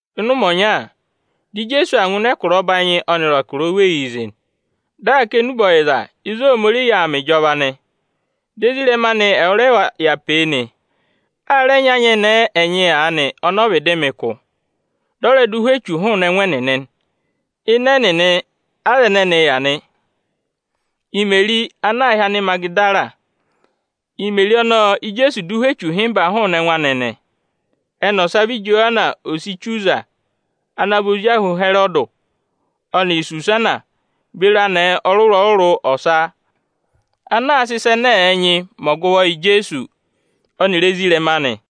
Ịnị ụmẹ ọnya, di Ijeesu aa ngụ ịnị ẹkụra ọbanyị ọnịrị ẹkụra oweyii zị, dị aa kà enube ọyịza ịzị Ohomorihi yà aa mẹ ịjọva nị. Ọnịrị ezirẹma anị ẹwụrẹva ẹ zị nị. A rẹ nyị anyẹnẹẹ ẹnyị aanị, ọnị ọ vịdị mẹ ụkụ, dị ọ rẹ dụ ụhwẹ echu hụụnị ẹngụ ẹnịnị. Ịnị ẹnịnị aza ẹnẹnị yà nị: Imeri ana aā hị́ Anịmagịdara; Imeri ọnọọ Íjeesu dụ ụhwẹ echu ịhịmba hụụnị ẹngụ anị nị. Ẹnị ọsa vị Ijowana, ose Ichuza ana vị ozi ahụ Ịhẹrọdị, ọnịrị Isusana beri anẹẹ ọrụrụ-ọrụrụ ọsa anaā sịị ịsa ẹnẹ ẹ̀ẹ nyịị mẹ ọgụvọ yị Ijeesu ọnịrị ezirẹma anị.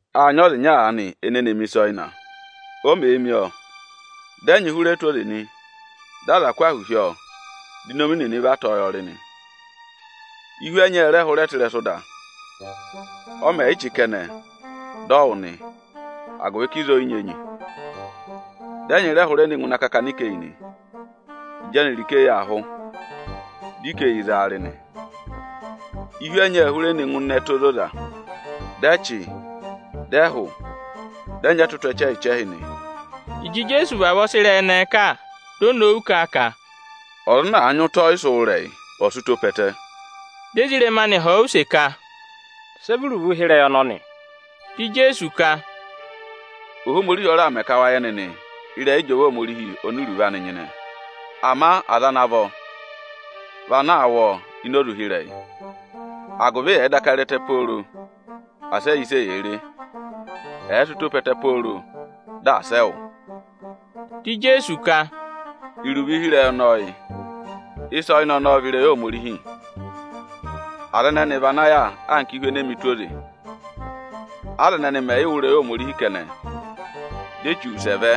“Â nyị ọza ịnya aanị ene ne mi ịsa ọyịna. O mèe mi ọọ, dị ẹnyị hụrẹ tụ́ ụtọ oze nị, dị aza kụ́ ahụ hi ọọ, di inomi nịnị va tọ̀ọ́ yọ rị nị. Ihu ẹnyị ẹ rẹ hụrẹ tụ́ ịrẹsụ ịda. Ọ mẹ̀ yị chị kẹnẹ, dị ọ wụ nị, agụvị ka ịzọọ ọ yị nyị enyi. Dị ẹnyị rẹ hụrẹ ne ngụ ịnị akakana ikeyi nị. Ịjị ẹnịrị ikeyi ẹnẹẹ aa hụ, di ikeyi za wa rị nị. Ihu ẹnyị ệ hụrẹ ne ngụ ịnị ẹtẹ ozoza, dị ẹ chị, dị ẹ hụ, dị ẹ nyị ẹtụtụ ẹchẹhị-ẹchẹhị nị.” Ịjị Ijeesu vavọọ sị ịrẹyị ẹnẹẹ kà, di o nowu kà a ka, “Ọza ana àa nyị ụtọ ọyịsị wụ́ ịrẹyị, ọ̀ sị ụtọ pe ẹtẹ!” Di ezirẹma anị họ̀ ọ use ka, “Sị ẹ vị iruvo ụhịrẹyị ọnọnị?” Di Ijeesu ka, “Ohomorihi ọ raà mẹ ka wa yẹ nịnị ịrẹyị ịjọva Ohomorihi oni iruvo anị nyịnẹ nịnị. Ama aza ana vọ vị ana aa wụ́ ọọ ini oze ụhịrẹyị, agụvị ẹ̀ẹ daka re ẹtẹ pooro, asị ẹ yẹ ịsị eyee re. Ẹ̀ẹ sị ụtọ pe ẹtẹ pooro, di asị ẹ wụ́.” Di Ijeesu ka, “Iruvo ụhịrẹyị ọnọọ yị: Ịsa ọyịna ọnọọ vị ịrẹyị Ohomorihi Aza ẹnẹnị vị ana yà anka ihu enee mi tụ́ ụtọ oze; aza ẹnẹnị mẹ̀ yị wụ́ ịrẹyị Ohomorihi kẹnẹ, di Echu wụsẹ vẹ,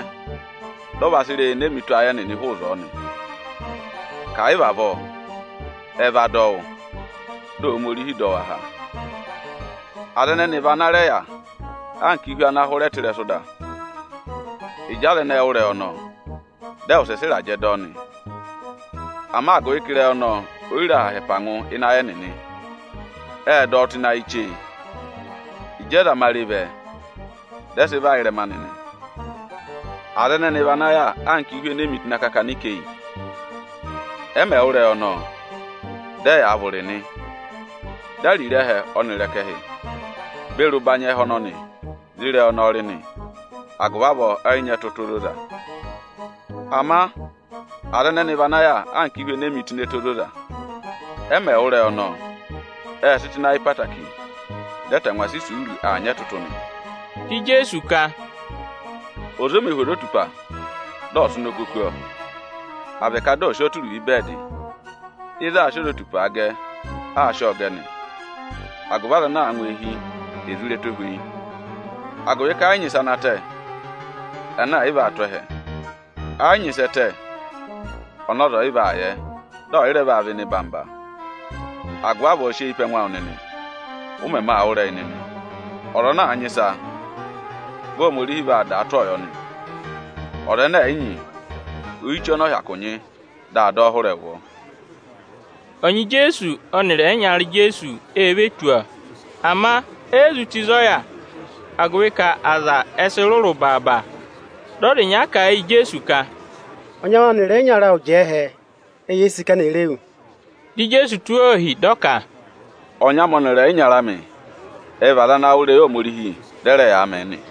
dị ọ va sị ịrẹyị enee mi tụ́ ayị ẹnịnị ịzọọ nị, ka ẹ̀ yị vị avọọ, ẹ va dọ wụ́, di Ohomorihi dọ wa há. Aza ẹnẹnị vị ana rẹ yà anka ihu ana hụrẹ tụ́ ịrẹsụ ịda. Aza ẹnẹẹ mẹ̀ wụ́ ịrẹyị ọnọọ, ệ wụsẹ sị ịrajẹ dọ ọ. Ama agụvị ka ịrẹyị ọnọọ o yi re aha ha ẹpa ngụ ịnị ayị ẹnịnị, ệ dọ ọ tụ́ ịnị ayị chee; ịjị ẹzamare vẹ, dị ẹ và hụụnị anị nị. Aza ẹnẹnị vị ana yà anka ihu ene e mi tụ́ ịnị akakana ikeyi. Ẹ mẹ̀ wụ́ ịrẹyị ọnọọ, dị ẹyaa vụrị nị. Ama ariro ẹhẹ ọnịrị ẹkẹhị beri ụbanyị ẹhẹ ọnọnị ộ za ịrẹyị ọnọọ rị; agụvị avọọ ẹtụtụ ẹnịnị e yi ve vi. Ama aza ẹnẹnị vị ana yà anka ihu ene e mi tụ́ ịnị ẹtẹ ozoza. Ẹ mẹ̀ wụ́ ịrẹyị ọnọọ, ệ sị tụ́ ịnị ayị ẹtẹẹtẹrẹ, dị ẹ tangwa sị isuuru aa nyị ẹtụtụ nị.” Di Ijeesu ka, “Ọza o mē hu ozotupa, dị ọ sị ụnọkọ kú ọọ, à vị ka dị ọ̀ sị ọọ tụ́ iruvo ịvẹẹdị. Ịzị aā sị ozotupaa gẹ, aa sị ọọ gẹ nị, agụvị aza ana aa ngụ eehi, è zụ re ẹtohweyi. Agụvị ka ẹ yị nyị ịsa ana tẹ, ẹnẹ ẹ̀ yị vaa tụ́ ẹhẹ; ẹ yị nyị ịsị ẹ tẹ, ọnị ọza ọ̀ yị vaa yẹ, dị ọ̀ yị rẹ vaa vẹ ịnị eyigede. Agụvị avọọ sị eyi pe ẹngụ awụ nịnị, ụ mẹmẹ aa wụ́ ịrẹyị nịnị! Ọza ana àa nyị ịsa, vị Ohomorihi vaa dàa tụ́ ọọ yọ nị. Ọza ẹnẹ ẹ̀ yị nyị, oyichee ọnị ọ hyakụ nyị, di aa dọ ọ hụrẹẹ ụvọ.” Ọnyị Ijeesu ọnịrị ẹyịnyara Ijeesu e ve tù ọ, ama e yi zụ tù ịzị ọ yà, agụvị ka aza ẹ sị rụrụ baaba. Dị ọza ịnya kà a yị Ijeesu ka, “Ọnyị awụ ọnịrị ẹyịnyara awụ jẹẹ ẹhẹ, eyee sì ka eni è re wu.” Dị Ijeesu tụ́ wa ohi, dị ọ ka, “Ọnyị amị ọnịrị ẹyịnyara amị ẹ vị aza ana aa wụ́ ịrẹyị Ohomorihi, dị ẹ rẹ yaa mẹ̀ ẹ nị.”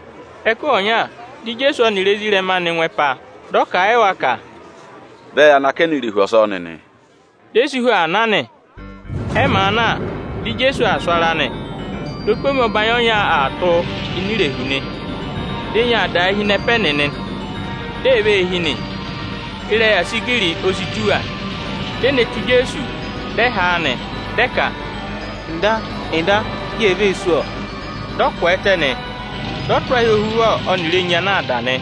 Ẹkụhị ọnya, dị Ijeesu ọnịrị ezirẹma anị ngụ ẹpa, dị ọ kà a yị wa ka, “Vẹ ya nọ akẹnẹ irehu eyi ọsọọ nịnị!” Di e si hu aa na nị. Ẹ màa na, dị Ijeesu aa sụ ara nị. Opomi ọbanyị ọnya aa tụ́ ini irehu; di enyi aa dàa hi ịnị ẹpa ẹnịnị, di ee vee hi nị. Ịrẹyị asigiri o si tù wa. Di e ne tù Ijeesu, dị ẹ ha a nị, dị ẹ ka, “Nda, Nda! Yee vee sú, ọ!” Dị ọ kwẹẹtẹ nị, dị ọ tụ́ ahị ohuvọ ọnịrị enyi ana aa dà nị,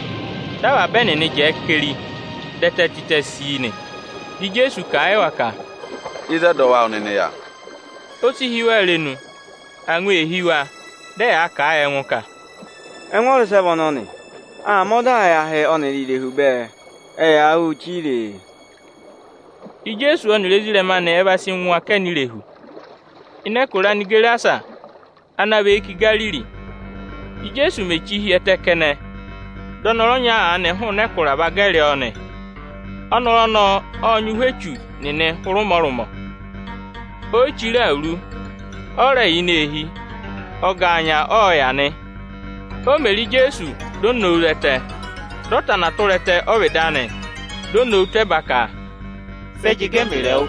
dị avaba ẹnịnị jẹẹ keri, dị ẹtẹ tịtẹ sii nị. Di Ijeesu kà a yị wa ka, “Ịzị ẹdọwụ awụ nịnị yà?” O si hí wa irenu, angwa ee hí wa, dị ẹ yaa kà a yị ẹngụ ka, “Ẹngụ ọza ịsị ẹ vị ọnọnị kẹ? Aa mẹ ọdaa yị ahị ọnịrị irehu bẹẹ, ẹ yaa wụ́ụ chire e.” Ijeesu ọnịrị ezirẹma anị ẹ va sị ngụ akẹnẹ irehu, ịnị ẹkụra Anigerasa, ana và eyi kà Igariri. Íjeesu mèe chíi hi ẹtẹ kẹnẹ, dị ọnọrụ ọnya aanị hụụnị ẹkụra va gẹrị ọọ nị. Ọnọrụ ọnọọ ộ nyị ụhwẹ echu nịnị; o si ku ọnị ọ̀ yị me chire awuru, ọ mā rẹ yà ini eehi, ọgaanya ọọ̄ yà nị. O mè re Ijeesu, di o nowu zẹtẹ, dị ọ tana tụra ẹtẹ ọ́vịdị anị, di o nowu tụ́ ẹba ka, “Sị ẹ jị gẹ ẹmịrị ẹwụ,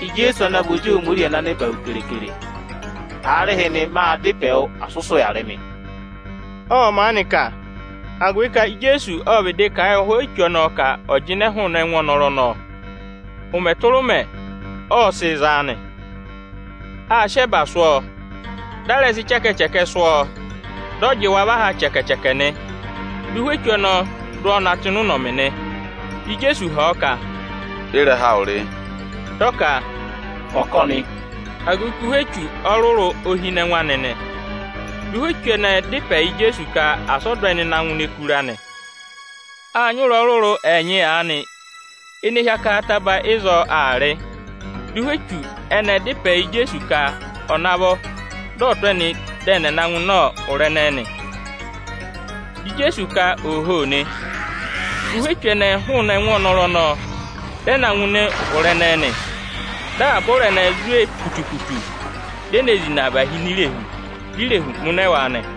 Ijeesu ana vị Ozi Ohomorihi ana nẹba hu keekere? Aarịhịnị, mâ dá ịpẹ wụ, asị ụ sị ụya rị mị!” Ộ maanị kà, agụvị ka Ijeesu ộ vịdị kà a yị ụhwẹ echu ẹnẹẹ ka ẹ̀ jịnẹ hụụnị ẹngụ ọnọrụ ọnọọ. Ụmẹ tụra ụmẹ, ọ sịị̄ za a nị. Â sị ẹba sụ́ ọọ, di a rẹ sị ịchẹkẹchẹkẹ sụ́ ọọ nị, ama dị ọ jị wa và ha chẹkẹ-chẹkẹ nị. Dị ụhwẹ echu ọnọọ dụ ọ na tụ́ ịnị ụnọmị nị. Dị Ijeesu họ̀ ọ ka, “Ị́rẹha awụ rị?” Dị ọ ka, “Ọkọnị”, agụvị ka ụhwẹ echu ọrụrụ o hi ịnị ẹngụ anị nị. Dị ụhwẹ echu ẹnẹẹ dá ịpẹ yị Ijeesu ka asị ọ dụ ẹnị na ngụ ini ẹkụra nị. Â nyị ụ̀rá ọrụrụ ẹnyị aanị ene hi akaha ataba ịzọọ aa rị. Dị ụhwẹ echu ẹnẹẹ dá ịpẹ yị Ijeesu ka ọ̀ navọ dị ọ̀ tụ́ ẹnị dị ẹnị ẹ̀ na ngụ ịnị ụra ẹnẹẹ nị. Dị Ijeesu ka ooho nị. Dị ụhwẹ echu ẹnẹẹ hụụnị ẹngụ ọnọrụ ọnọọ, dị ẹ na ngụ ịnị ụra ẹnẹẹ nị. Dị avaba ụra ẹnẹẹ zwe putu-putu, di e zina và hi ini irehu, di irehu mụnẹ wa nị.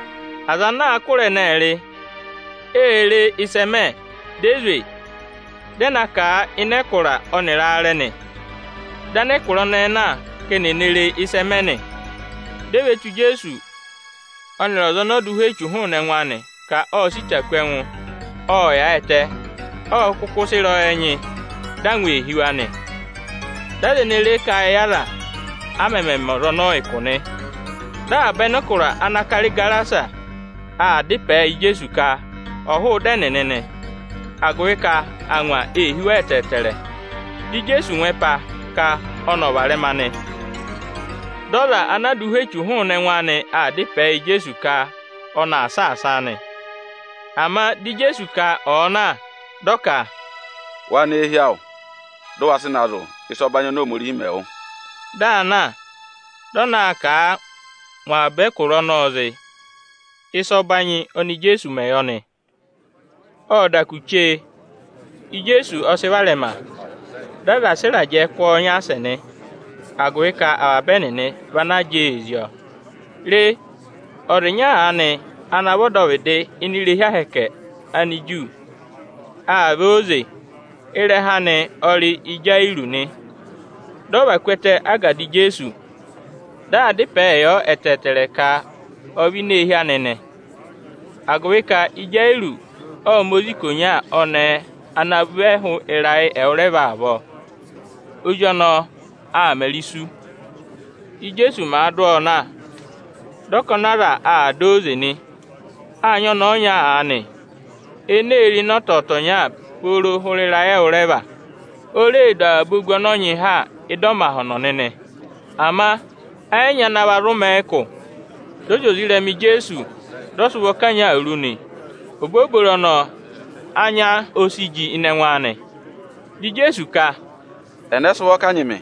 Aza anaā kụ́ ụra ẹnẹẹ rị, ê re ịsị ẹ mẹ, di e zwe, dị ẹ na kà a ịnị ẹkụra ọnịrị aarẹ nị. Dị anẹkụra ẹnẹẹ na ka eni è ne re ịsị ẹ mẹ nị. Di e ve tù Ijeesu ọnịrị ọza ọnọọ dụ ụhwẹ echu hụụnị ẹngụ anị ka ộ sị ịta kú ẹngụ, ộ yaayịtẹ, ọ kụkụ sị ịrẹyọyẹ nyị nị. Dị angwa ee hí wa nị. Dị aza ene re e kà a yị aza, a mẹmẹ mẹ ọza ọnọọ ụkụ nị. Dị avaba anẹkụra ana kara Igerasa aa dá ịpẹẹ yị Ijeesu ka ọ̀ hụụ ịdị ẹnịnị nị, agụvị ka angwa ee hí wa ẹtẹẹtẹrẹ. Dị Ijeesu ngụ ẹpa, ka ọnị ọ̀ varẹma nị. Dị ọza ana a dụ ụhwẹ echu hụụnị ẹngụ anị aanị, aa dá ịpẹẹ yị Ijeesu ka ọnị aa saasa a nị. Ama di Ijeesu ka ọ̀ọ na, dị ọ ka: “Wa nọ eehi awụ, dị ụ wa sị na zụ̀ ịsa ọbanyị oni Ohomorihi mẹ wụ!” Di aa na, dị ọ naa kà a ngụ avaba ẹkụra ọnọọ zị ịsa ọbanyị oni Ijeesu mẹ yọ nị. Ộ da kù chee, Ijeesu ọ sị varẹma. Dị aza sị ịrajẹ kụ́ ọọ nyaasẹ nị, agụvị ka avaba ẹnịnị vị ana jẹẹ ee zí ọọ. Re, ọza ịnya aanị ana vị ọdọvịdị ini irehi ahẹkẹ Aniju, ộ vẹ. Ịrẹha anị ọ rị Ịjayịrọọsị nị. Dị ọ và ku ẹtẹ ágada Ijeesu, dị aa dá ịpẹẹ yọ ẹtẹẹtẹrẹ ka ọ̀ vẹ ini eehi anị nị, agụvị ka Ịjayịrọọsị ộ ma ozi ikonya ọnẹẹ, ana vị ẹhụụ ịrayị ẹwụrẹva avọọ, ozi ọnọọ aa mẹrị isu. Ìjeesu màa dụ ọọ na, dị ọkọnị aza aa dọ ọ óze nị. Â nyị ọnẹẹ ọnya aanị, ene ee re ịnẹ ọtọtọnya pooro hụrẹ ịrayị ẹwụrẹva. O reè du avaba ogu ọnọọ nyị ha ị́dị ọmahọnọ nịnị, ama ẹ yị nyị ana va zụ mẹ̀ ẹ ụkụ. Dị ọ zị oze ị́rẹma Ijeesu, dị ọ sị ụvọ kanyị ọọ ụtọ awuru nị. Obooboro ọnọọ, anya o si ji ịnị ẹngụ anị. Dị Ijeesu ka, “Ẹnẹ sị ụvọ kanyị mị?”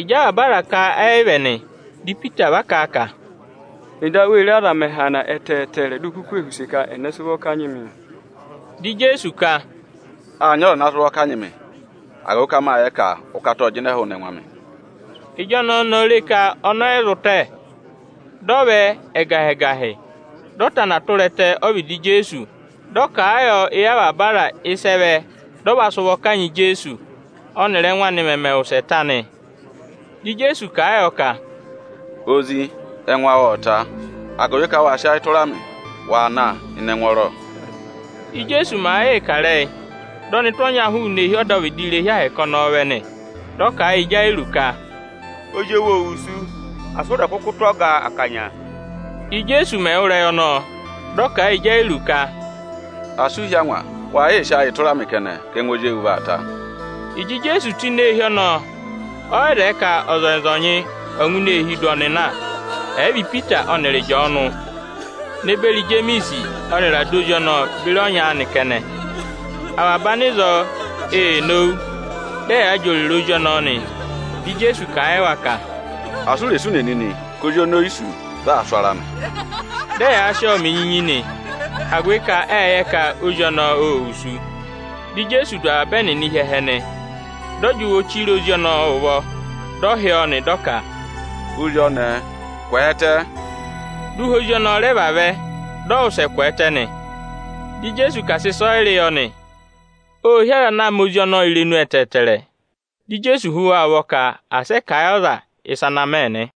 Ịjị avaba aza ka ẹ yị vị ẹnị, di Ipita va kà a ka, “Nda, wee re, aza mẹ̀ hana ẹtẹẹtẹrẹ, di u kuku ee họ̀ use ka: Ẹnẹ sị ụvọ kanyị mịị?” Di Ijeesu ka, “Â nyị ọza ana sị ụvọ kanyị mị: agụvị ka mâ yẹ ka ụkata ộ jịnẹ hụụnị ẹngụ amị.” Ịjị ọnẹẹ ọnọọ re ka ọnị ọ yị zụ tẹ, dị ọ vẹ ẹgahị-ẹgahị, dị ọ tana tụra ẹtẹ ọ́vịdị Ijeesu, dị ọ kà a yọ éyi avaba aza ịsị ẹ vẹ dị ọnị va sị ụvọ kanyị Ijeesu, ọnịrị ẹ́ngụ anị mẹmẹ wụsẹ ta nị. Di Ijeesu kà a yọ ka, “Ozi, ẹngụ awụ ộ ta, agụvị ka wâ sị ayị tụra mị. Waa na ịnị ẹngwọọrọ!” Íjeesu màa yịị kà ịrẹyị, dị ọnụtụ ọnya hụụnị eehi ọdọvịdị irehi Ohomorihi ọnọọ vẹ nị. Dị ọ kà a yị Ịjayịrọọsị ka, “Ozi ewu ô wusu, asị ụ rẹ̀ kụkụ tụ́ Ọga akanya!” Íjeesu mẹ̀ wụ́ ịrẹyị ọnọọ, dị ọ kà a yị Ịjayịrọọsị ka, “Asị u hí angwa, wa yị sị ayị tụra mị kẹnẹ ka ẹngụ ozi ewu vaa ta!” Ịjị Ijeesu tù ini eehi ọnọọ, ọ yị zẹẹ ka ọzọnyị-ọzọnyị ọ̀ ngụ ini eehi dụ ọnị na, ẹ̀ yị vị Ipita ọnịrị Ịjọọnụ ne beri Ijemiisi ọnịrị ada ozi ọnọọ beri ọnyị anị kẹnẹ. Avaba anịzọọ ee nowu, dị ẹyaa jị òrèrè ozi ọnọọ nị. Dị Ijeesu kà a yị wa ka, “Asị u rè sụ ùnè nịnị, ka ozi ọnọọ o yi sú; vị aa sụ ara nị!” Dị ẹ yaa sị ọọ mẹ enyinyi nị, agụvị ka ệ yẹ ka ozi ọnọọ ô wusu. Dị Ijeesu dụ avaba ẹnịnị hi ẹhẹ nị. Dị ọ jị ụvọ chire ozi ọnọọ ụvọ, dị ọ hị́ ọọ nị, dị ọ ka, “Ozi ọnẹẹ, kwẹẹtẹ!” Dị ụhwẹ ozi ọnọọ rẹ vavẹ, dị ọ wụsẹ kwẹẹtẹ nị. Dị Ijeesu ka à sị ịsọyịrị yọ nị. Ô hí aza ana ma ozi ọnọọ irenu ẹtẹẹtẹrẹ. Dị Ijeesu hú wa ụvọ ka asị ẹ kà a yị ọza ịsa ana mẹ nị.